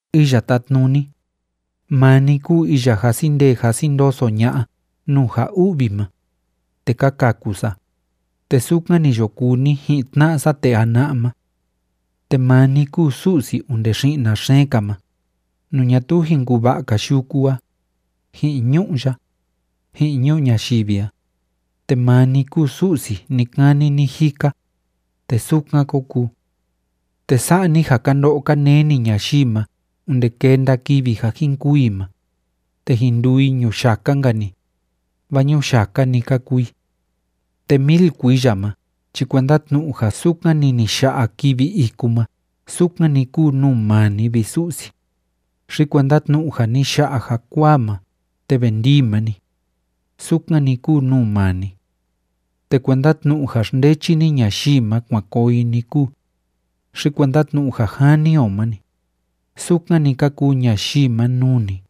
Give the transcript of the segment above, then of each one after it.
Iya Tátnuni, maa ni kúu iya jasi ndee jasi ndoso ña'a nuu ja u'vi ma, te ka kaku sa, te sukan ni yo kuu ni ji'in tna'a sa tee jana'a ma. Te maa ni kúu Su'si onde xi'na xeen‑ka ma, nuu ñatuu jin kuva'a‑ka yuku a, ji'in ñu'ú ya, ji'in ñuu ñayivi a, te maa ni kúu Su'si ni‑kani ni‑jika, te sukan kó kuu. Te sa'a ni ja ka ndo'o ka neni ñayii ma onde kenda kivi ja jin kûu i ma, te jin nduu i ñuyaka‑nka‑ni, vaa ñuyaka‑ni ka kuu i. Te mil kuiya ma chi kuenda tnu'u ja sukan‑ni ni ya'a kivi iku ma sukan‑ni kúu nuu maa ni, vi Su'si, xi kuenda tnu'u ja ni ya'a jakuaa ma te ve ndii ma‑ni, sukan‑ni kúu nuu maa ni. Te kuenda tnu'u ja xndechi ni ñayii ma kuan koo i‑ni kúu, xi kuenda tnu'u ja jani o ma‑ni, sukan‑ni ka kuu ñayii ma nuu ni,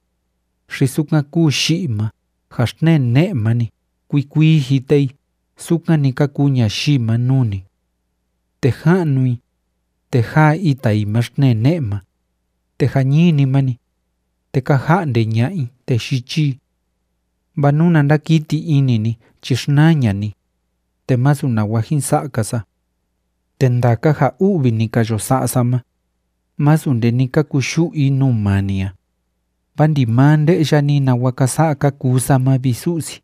xi sukan kúu yi'i ma ja xtnee ne'e ma‑ni kuii kuii jite i sukan‑ni ka kuu ñayii ma nuu ni. Te ja'nu i, te jáa ita i ma xtnee ne'e ma, te jañini ma‑ni, te ka ja'nde ña'a i, te yichi i. Vaa nuna ndakiti ini ni chi xnaa ña'a ni, te masu nawa jin sa'a‑ka sa. Te ndaka ja u'vi ni ka yo sa'a sa ma, masu nde ni ka kuyu'u i nuu maa ni a, vaa ndimaa nde'ya ni nawa ka sa'a ka kuu sa ma, vi Su'si.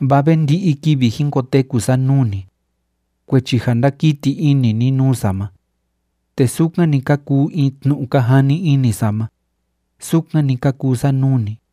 Vaa ve ndi'i kivi jin koteku sa nuu ni, kuechi ja ndákiti ini ni nuu sa ma, te sukan‑ni ka kuu in tnu'u ka jani ini sa ma, sukan‑ni ka kuu sa nuu ni.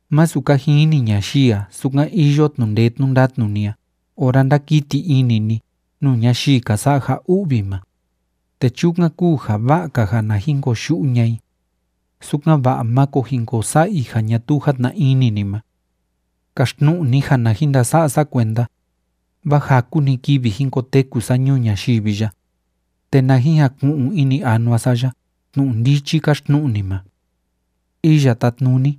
Másu ka jini ñayii a sukan iyo tnu'u ndee tnu'u ndatnu ni a ora ndákiti ini ni nuu ñayii ka sa'a ja u'vi ma, te chukan kúu ja va'a‑ka ja na jin koyu'u ña'a i, sukan‑va'a máko jin ko sa'a i ja ñatuu játna ini ni ma. Kaxtnu'u ni ja na jin ndasa'a sa kuenda, vaa jaku‑ni kivi jin koteku sa ñuu ñayivi ya, te na jin jaku'un ini anua sa ya tnu'u ndichi káxtnu'u ni ma. Iya Tátnuni,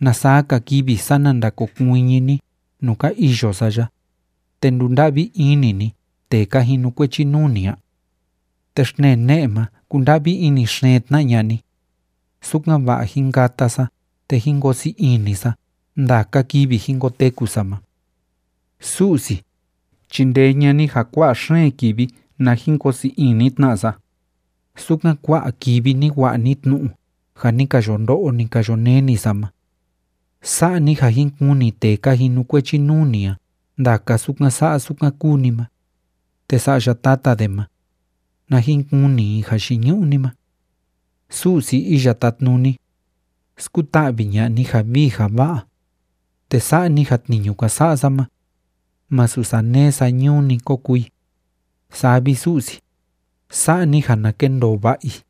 ¿na saa‑ka kivi, sana ndakokuiñi ni nuu ka iyo sa ya, te ndunda'vi ini ni tee ka jinukuechi nuu ni a? Te xtnee ne'e ma kunda'vi ini xeen tna ña'a ni, sukan‑va'a jin kata sa te jin koo sii ini sa ndaka kivi jin koteku sa ma. Su'si, chindee ña'a ni ja kua'a xeen kivi na jin koo sii ini tna sa, sukan kua'a kivi ni wa'a ni tnu'u ja ni ka yo ndo'o, ni ka yo neni sa ma. Sa'a ni ja jin kuni tee ka jinukuechi nuu ni a ndaka sukan sa'a sukan kúu ni ma, te sa'ya tata de ma, na jin kuni i jayiñu'u ni ma. Su'si Iya Tátnuni, skuta'vi ña'a ni ja vii ja va'a, te sa'a ni ja tniñu ka sa'a sa ma, masu saneé sañuu‑ni ko kuu i. Saa vi, Su'si, sa'a ni ja na kendoo va'a i.